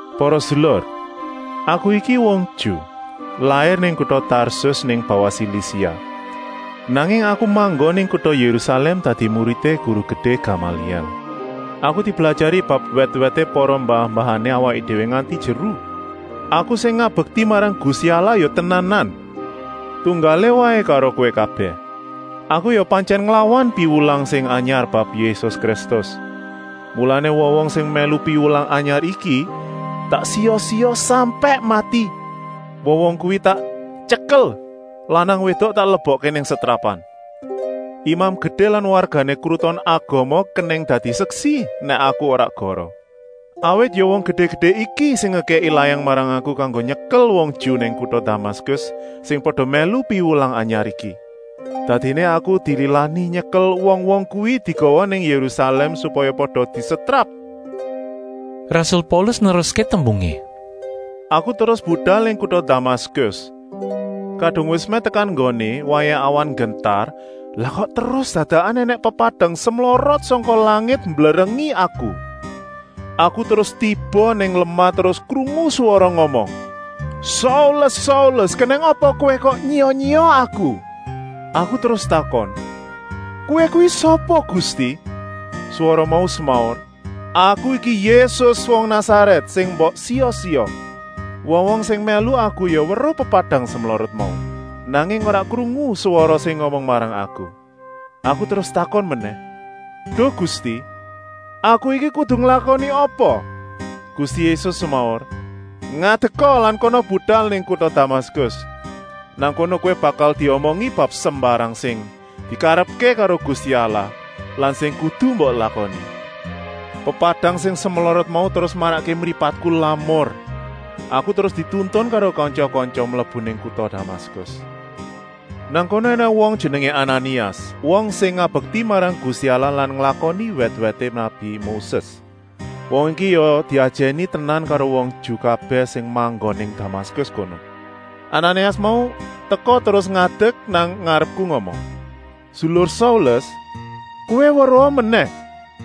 “Para sedulur, aku iki wong Ju, lair nang kuta Tarsus nang bawah Silisia, nanging aku manggon nang kuta Yérusalèm dadi muridé guru gedé Gamalièl. Aku diblajari bab wèt-wèté para mbah-mbahané awaké déwé nganti jeru. Aku sing ngabekti marang Gusti Allah ya tenanan, tunggalé waé karo kowé kabèh. Aku ya pantyèn nglawan piwulang sing anyar bab Yésus Kristus. Mulané wong-wong sing mèlu piwulang anyar iki tak siya-siya sampèk mati. Wong-wong kuwi tak tyekel, lanang-wédok tak lebokké nang setrapan. Imam Gedé lan wargané Kruton Agama kenèng dadi seksi nèk aku ora goroh. Awit ya wong gedé-gedé iki sing ngekèki layang marang aku kanggo nyekel wong Ju nang kuta Damaskus sing pada mèlu piwulang anyar iki. Dadiné aku dililani nyekel wong-wong kuwi digawa nang Yérusalèm supaya pada disetrap.” Rasul Paulus neruské tembungé: “Aku terus budal nang kuta Damaskus. Kadung wis mèh tekan nggoné, wayah awan nggentar, lah kok terus dadakan ènèng pepadang semlorot sangka langit mblerengi aku. Aku terus tiba nang lemah terus krungu swara ngomong: ‘Saulus, Saulus, kenèng apa kowé kok nyiya-nyiya Aku?’ Aku terus takon: ‘Kowé kuwi sapa Gusti?’ Swara mau semaur: ‘Aku iki Yésus wong Nasarèt, sing mbok siya-siya!’ Wong-wong sing mèlu aku ya weruh pepadang semlorot mau, nanging ora krungu swara sing ngomong marang aku. Aku terus takon menèh: ‘Duh Gusti, aku saiki kudu nglakoni apa?’ Gusti Yésus semaur: ‘Ngadeka lan kana budal nang kuta Damaskus. Nang kono kowé bakal diomongi bab sembarang sing dikarepké karo Gusti Allah lan sing kudu mbok lakoni!’ Pepadang sing semlorot mau terus marakké mripatku lamur. Aku terus dituntun karo kantya-kantya mlebu nang kuta Damaskus. “Nang kono ènèng wong jenengé Ananias, wong sing ngabekti marang Gusti Allah lan nglakoni wèt-wèté nabi Moses. Wong iki ya diajèni tenan karo wong Ju kabèh sing manggon nang Damaskus kono. Ananias mau teka terus ngadek nang ngarepku ngomong: ‘Sedulur Saulus, kowé weruha menèh!’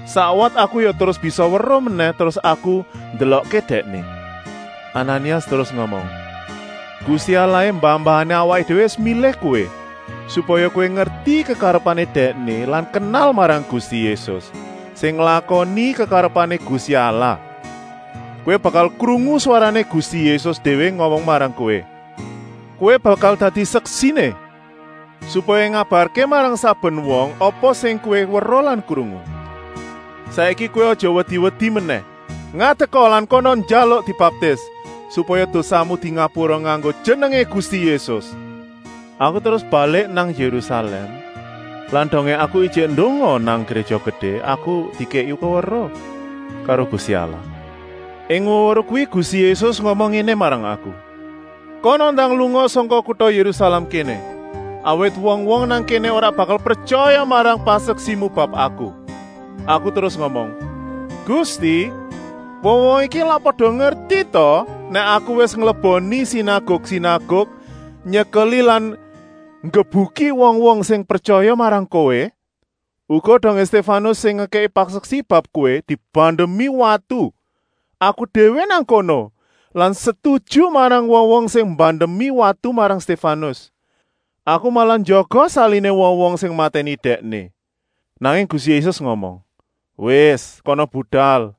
Sakwat aku ya terus bisa weruh menèh terus aku ndelokké dèkné. Ananias terus ngomong: ‘Gusti Allahé mbah-mbahané awaké déwé wis milih kowé, supaya kowé ngerti kekarepané Dèkné lan kenal marang Gusti Yésus, sing nglakoni kekarepané Gusti Allah. Kowé bakal krungu swarané Gusti Yésus déwé ngomong marang kowé. Kowé bakal dadi seksiné, supaya ngabarké marang saben wong apa sing kowé weruh lan krungu. Saiki kowé aja wedi-wedi menèh, ngadeka lan kana njaluk dibaptis, supaya dosamu dingapura nganggo jenengé Gusti Yésus.’ “Aku terus balik nang Yérusalèm lan dongé aku ijik ndonga nang Gréja Gedé, aku dikèki weweruh karo Gusti Allah. Ing weweruh kuwi Gusti Yésus ngomong ngéné marang aku: ‘Kana ndang lunga sangka kuta Yérusalèm kéné, awit wong-wong nang kéné ora bakal pretyaya marang paseksimu bab Aku!’ Aku terus ngomong: ‘Gusti, wong-wong iki lak pada ngerti ta nèk aku wis ngleboni sinaguk-sinaguk nyekeli lan nggebuki wong-wong sing pretyaya marang Kowé?’ Uga dongé Stéfanus, sing ngekèki paseksi bab Kowé dibandemi watu. Aku déwé nang kono lan setuju marang wong-wong sing mbandemi watu marang Stéfanus. Aku malah njaga saliné wong-wong sing matèni dèkné! Nanging Gusti Yésus ngomong: ‘Wis, kana budal,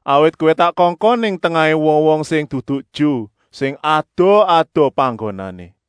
awit kowé tak kongkon nang tengahé wong-wong sing dudu Ju, sing adoh-adoh panggonané!’”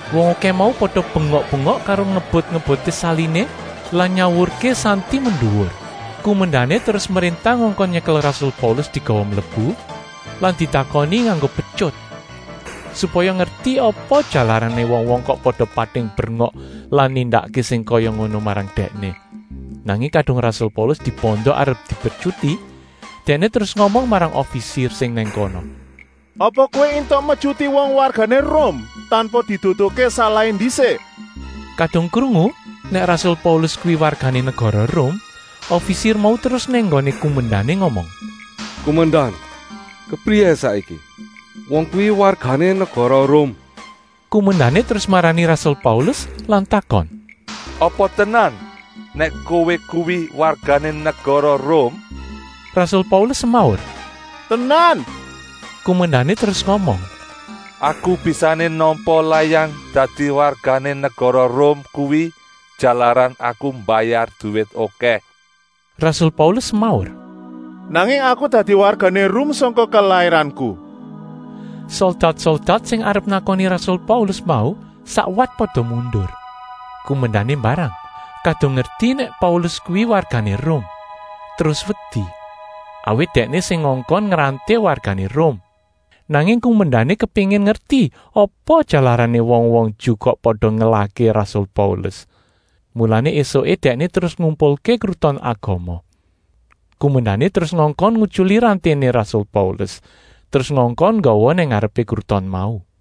Wong okèh mau pada bengok-bengok karo ngebut-ngebutké saliné lan nyawurké santi menduwur. Kumendané terus mréntah ngongkon nyekel rasul Paulus digawa mlebu lan ditakoni nganggo petyut, supaya ngerti apa jalarané wong-wong kok pada pating brengok lan nindakké sing kaya ngono marang dèkné. Nanging kadung rasul Paulus dibanda arep dipetyuti, dèkné terus ngomong marang ofisir sing nang kono: “Apa kowé éntuk metyuti wong wargané Rum, tanpa diduduhké salahé ndisik?” Kadung krungu nèk rasul Paulus kuwi wargané negara Rum, ofisir mau terus nang nggoné kumendané ngomong: “Kumendan, kepriyé saiki! Wong kuwi wargané negara Rum!” Kumendané terus marani rasul Paulus lan takon: “Apa tenan nèk kowé kuwi wargané negara Rum?” Rasul Paulus semaur: “Tenan!” Kumendané terus ngomong: “Aku bisané nampa layang dadi wargané negara Rum kuwi jalaran aku mbayar duwit okèh!” Rasul Paulus semaur: “Nanging aku dadi wargané Rum sangka kelairanku.” Soldat-soldat sing arep nakoni rasul Paulus mau sakwat pada mundur. Kumendané mbarang, kadung ngerti nèk Paulus kuwi wargané Rum, terus wedi, awit dèkné sing ngongkon ngranté wargané Rum. Nanging kumendané kepéngin ngerti apa jalarané wong-wong Ju kok pada ngelahké rasul Paulus. Mulané ésuké dèkné terus ngumpulké Kruton Agama. Kumendané terus ngongkon ngutyuli ranténé rasul Paulus, terus ngongkon nggawa nang ngarepé kruton mau.